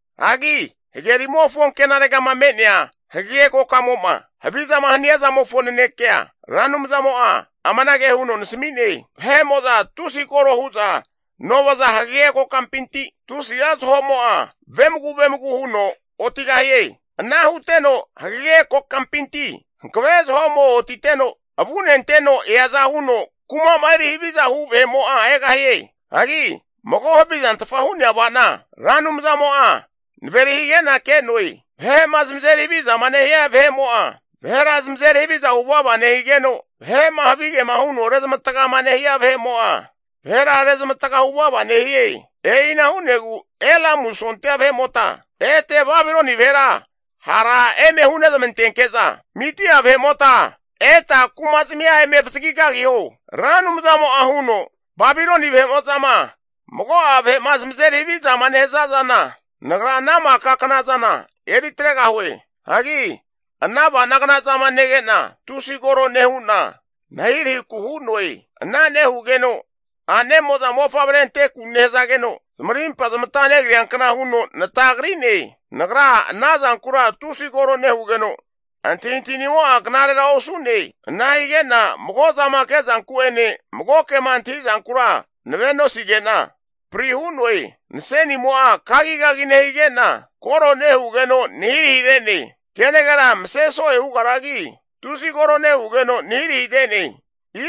Hagi hagerimofo ankenaregama me'nea hagege kokamo'ma havizama hania zamofo nanekea Ra Anumzamo'a amanage huno nasami'ne, Vahe'mo'za tusi koro hu'za novaza hagege kokampinti tusi'a zahomo'a vemagu vemagu huno otigahie. Ana huteno hagege kokampinti hankave zaho'mo otiteno avunenteno eaza huno kumama eri haviza hu vahe'mo'a egahie. Hagi mago havizantfa hu'nea ava'na Ra Anumzamo'a naveri hige'na ke'noe. Vahe'ma zamazeri havizama nehia vahe'mo'a vahera zamazeri haviza hu vava nehigeno, vahe'ma havigema huno rezamatga nehia vahe'mo'a, vahera rezmavataga hu vava nehie. E'ina hu'negu Elamu sondia vahe'mota ete Babiloni vahera hara eme hunezmantenke'za, Midia vahe'mota eta kumazmia eme avazagi kagiho. Ra Anumzamo'a huno, Babiloni vahe'mo'zama mago'a vahe'ma zamazeri havizama nehaza zana, nagra ana maka knazana eri atregahue. Hagi ana avanagna zama nege'na, tusi koro nehu'na nahirahiku hu'noe. Ana nehugeno a'nemo'za mofavre anteku nehazageno, zamarimpa zamata negriankna huno natagri'ne. Nagra ana zankura tusi koro nehugeno, antahintahinimo'a knarera osu'ne. Ana hige'na mago'zama kezanku'ene mago kema antahi zankura nave'osige'na pri hu'noe. Nasenimo'a kagigagi nehige'na, koro nehugeno nahirahire'ne. Kenagera mase so'e hugaragi tusi koro nehugeno nahirahire'ne.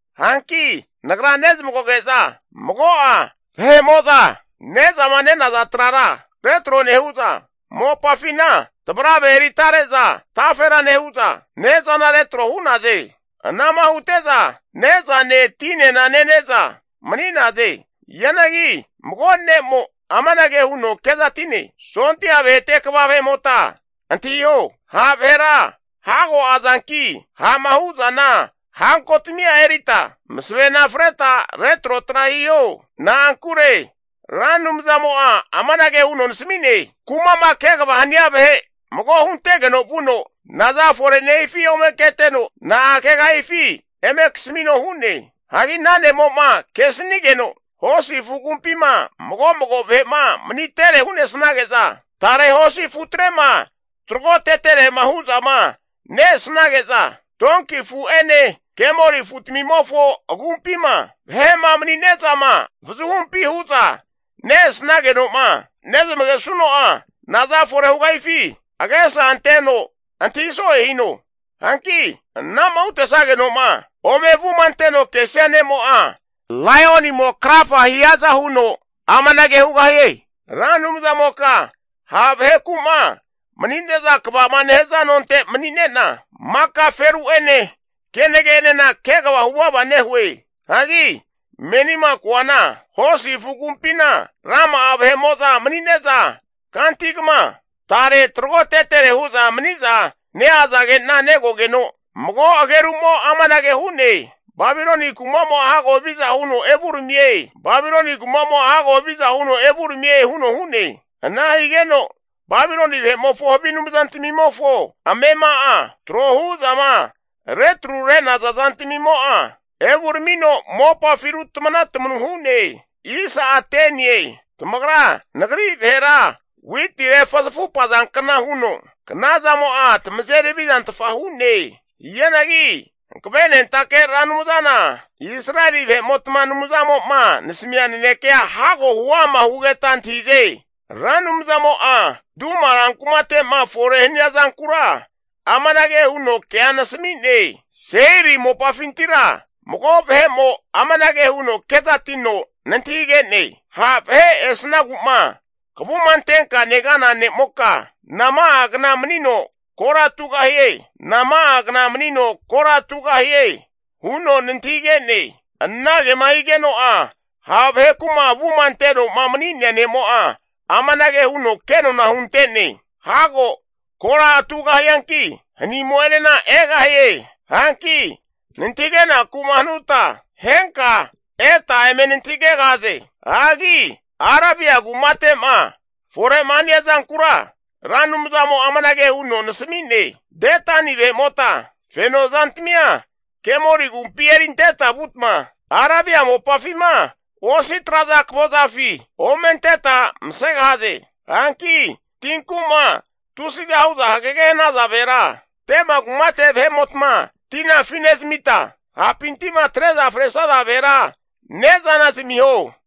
Hanki nagra nezmagoge'za mago'a vahe'mo'za ne'zama nenaza trara retro nehu'za, mopafina tavarave eri tare'za tafera nehu'za ne'zana retro hu'naze. Anama hute'za ne'zane tinena nene'za mani'naze. Hianagi mago ne'mo amanage huno kezati'ne, sondia vahete kva vahe'mota antahiho, ha' vahera hago azanki, ha'ma hu'zana hankotamia erita masavena freta retrotra hiho. Na'ankure Ra Anumzamo'a amanage huno nasami'ne, kuma'ma kegava hania vahe mago huntegeno vuno naza fore nehifi ome keteno, na'a kegahifi eme kasamino hu'ne. Hagi ana ne'mo'ma kesinigeno, hosi afu agumpima mago mago vahe'ma manitere hu'nesnage'za tare hosi afutrema taragoteterema hu'zama ne-esnage'za, donki afu'ene kemoli afutamimofo agumpima vahe'ma mani'nezama avazuhumpi huza ne-esageno'ma nezmagesuno'a naza fore hugahifi agesa anteno antahi so'e hino. Hanki anama huntazageno'ma ome avuma anteno kesia ne'mo'a laionimo krafa hiaza huno amanage hugahie, Ra Anumzamoka ha' vaheku'ma mani'neza kvama nehaza nonte mani'nena maka feru'ene kenage'enena kegava huvava nehue. Hagi menima koana, hosi afu agumpina rama'a vahe'mo'za mani'ne'za kantigama tare tragotetere hu'za maniza neazage'na negogeno, mago agerumo amanage hu'ne, Babiloni kumamo'a hago haviza huno evuramie, Babiloni kumamo'a hago haviza huno evuramie huno hu'ne. Ana higeno Babiloni vahe'mofo havi anumzantamimofo amema'a tro hu'zama retru re'naza zantamimo'a evuramino mopafi rutma tamanu hu'ne! Tamagra nagri vahera witi refuzafupazankna huno knazamo'a tamazeri havizantfa hu'ne. Hianagi Hankavenentake Ra Anumzana Israeli vahe'motma Anumzamo'ma nasamia nanekea hago huama hugeta antahize. Ra Anumzamo'a Duma ran kumate'ma fore hania zankura amanage huno kea nasami'ne, Seiri mopafintira mago vahe'mo amanage huno kezatino nantahige'ne, ha' vahe esnagu'ma kavuma antenka negana ne'moka, nama'a kna manino kora tugahie. Nama'a kna manino kora tugahie, huno nantahige'ne? Anage'ma higeno'a ha' vaheku'ma avuma atenoma mani'nea ne'mo'a amanage huno kenona hunte'ne, hago kora atugahianagi, hanimo'enena egahie. Hanki nantahigenaku'ma hanuta henka eta eme nantahigegahaze. Hagi Arabia kumate'ma fore'ma hania zankura Ra Anumzamo'a amanage huno nasami'ne, Dedani vahe'mota feno zantamia kemoli agumpi erinteta vutma, Arabia mopafima osi traza akavozafi ome anteta masegahaze. Hanki tinku'ma tusiza hu'za hagege hanaza vahera, Tema kumate vahe'motma tina afinezmita, hapinti'ma atre'za fresaza vahera ne'zana zamiho.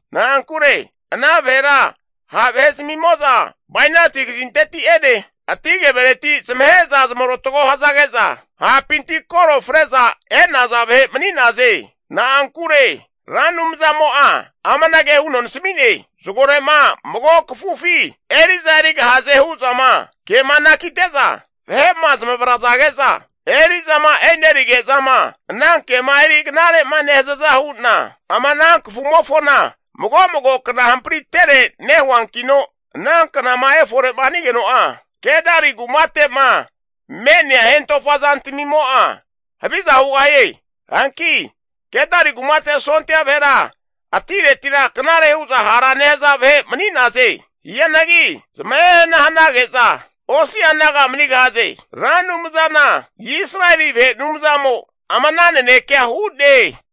Na'ankure ana vahera ha' vahe zamimo'za bainati kazinteti'ene ati kevereti zamahe'za zamarotago hazage'za hapinti koro fre'za e'naza vahe mani'naze. Na'ankure Ra Anumzamo'a amanage huno nasami'ne, zagore'ma mago kafufi eri'za erigahaze hu'zama kema anakite'za vahe'ma zamavrazage'za, eri'zama enerige'zama ana kema eri knare'ma nehazaza hu'na, ama ana kafumofona mago mago kna hamparintere nehuankino, ana knama efore'ma hanigeno'a, Kedari kumate'ma me'nea hentofa zantamimo'a haviza hugahie. Hanki Kedari kumate sondia vahera atiretira knare hu'za hara nehaza vahe mani'naze. Hianagi zamahe hana hanage'za, osi'a naga manigahaze. Ra Anumzana Israeli vahe Anumzamo ama ana nanekea hu'ne.